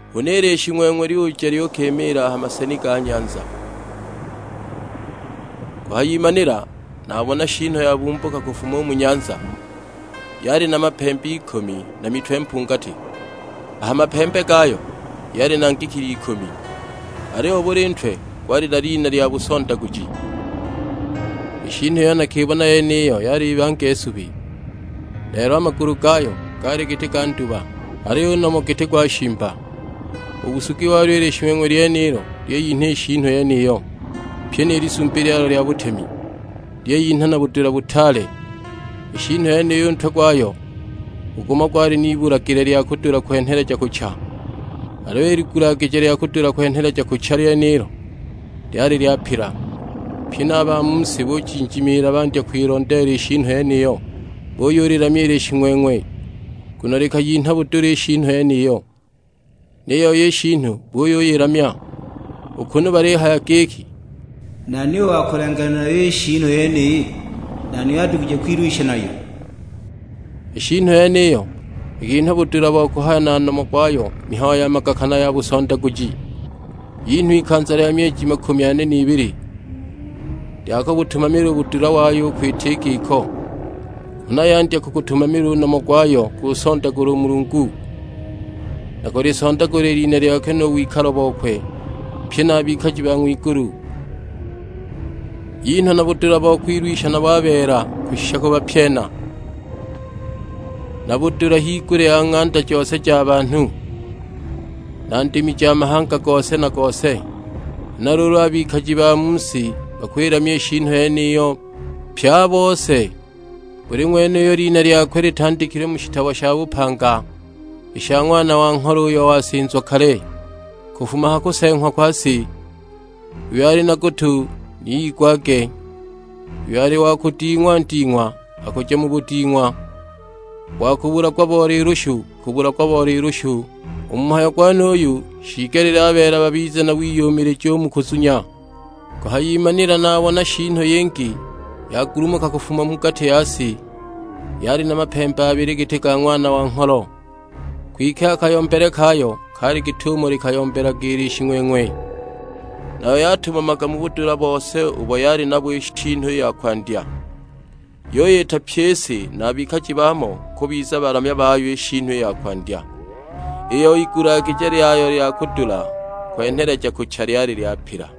Huna i Lishing'weng'we lyuja lyukimiila ha maseni ga ha nyanza. Kuhayimanila nabona shiinu yabumbuka kufuma u mu nyanza, yali na mapembe ikumi na mitwe mpungati. A ha mapembe gayo yali na ngikili ikumi, aliyo buli ntwe gwali na lina lya busondaguji. I shiinu iyo nakibona yeniyo yali ibange subi, lelo a magulu gayo gaali giti ga nduba, aliyo u nomo giti gwa shimba. U busugi walyo i Lishing'weng'we lyiyinha i shiinu yeniyo, pyi ni lisumbi lyalyo lya butemi; lyiyinha na budula butaale. I shiinu yeniyo u ntwe gwayo u gumo gwali n'igulagije lya kudula kwenheleja kucha; aliyo i ligulagije lya kudula kwenheleja kucha lyenilo, lyali lyapila. Pye a ba mu si bujinjimala bandya kwilondeela i shiinu yeniyo. Buyulilamya i Lishing'weng'we, nguno likayinha budula i shiinu yeniyo. Ni yoi i shiinu buyuyilamya, u kunu balihaya giki, "Nani u wa kulenganila nayo i shiinu yeniyi? Nani uyo adugije kwilwisha nayo?" I shiinu yeniyo ikinhwa budula bo kuhaya na nomo gwayo mihayo ya magaka na ya busondaguji; yinhwa ikanza lya myeji makumi ane n'bili, lya kubutumamila u budula wayo u kwita i giko. Huna yandya kugutumamila u nomo gwayo kunsondagula u Mulungu, na kulisondagula i lina lyakwe nu wikalo bokwe, pye na a bikaji ba ng'wigulu. Yinhwa na budula bo kwilwisha nabo a beela kushisha kubapyena, na budula higulya ya ng'anda jose ja banhu, na ndimi ja mahanga gose na gose. Huna luulu a bikaji ba mu si bakwilamya i shiinu yeniyo; pye a bose: buli ng'wene uyo lina lyakwe litandikilwe mu shitabo sha bupanga i sha Ng'wana wa Ngholo uyo wasinzwa kale, kufuma ha kuseeng'wa kwa si. Uyo ali na gutu ni igwage! Uyo ali wa kuding'wa nding'wa, akuja mu buding'wa; u wa kubulagwa bo lilushu, akubulagwa bo lilushu! U mu mhayo gwenuyu shiigelile a beela babize na wiyumilija u mu kuzunya. Kuhayimanila nabona shiinu yingi yagulumuka kufuma mu gati ya si, yali na mapembe abili giti ga Ng'wana wa Ngholo, kwike a kayombele kayo kaali git'umo likayombelaga i Lishing'weng'we! Nayo yatumamaga mu budula bose ubo yali nabo i shiinu i ya kwandya; yuyita pyi i si na a bikaji baamo kubiza balamya bayo i shiinu i ya kwandya, iyo igulagije lyayo lya kudula kwenheleja kucha lyali lyapila.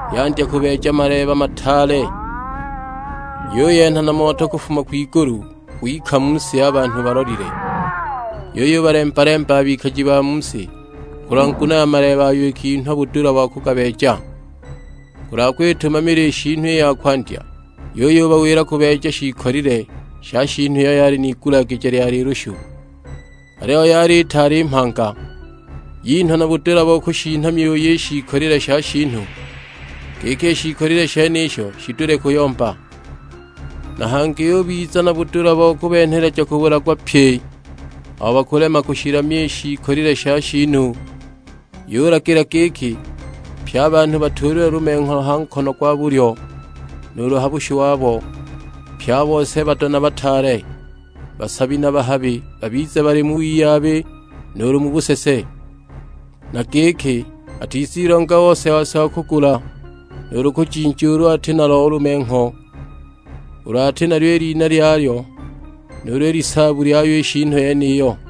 Yandya kubeeja maleeba mataale; yuyenha na moto kufuma kwigulu gwika mu si a banhu balolile. Yuyubalemba-lemaba a bikaji ba mu si kulwa nguno ya maleeba ayo ikinhwa budula bo kugabeeja, kulwa kwitumamila i shiinu i ya kwandya; yuyubawila kubeeja shiikolile sha shiinu iyo yali n'igulagije lya lilushu, aliyo yali itaali mhanga. Yinhwa na budula bo kushinha myuyi i shiikolile sha shiinu, giki i shiikolile shenisho shidule kuyomba. Na hangi yubiza na budula bo kubenheleja kubulagwa pye abo bakulema kushilamya i shiikolile sha shiinu. Yulagila giki pye a banhu batuulilwe lumengho ha nkono gwa bulyo, nuulu ha bushu wabo; pye a bose bado na bataale, basabi na bahabi, babize bali mu wiyabi nuulu mu busese; na giki atizilonga ose-ose wa kugula nuulu kujinja ulu ati nalo u lumengho; ulu ati nalyo i lina lyayo nuulu i lisaabu lyayo i shiinu yeniyo.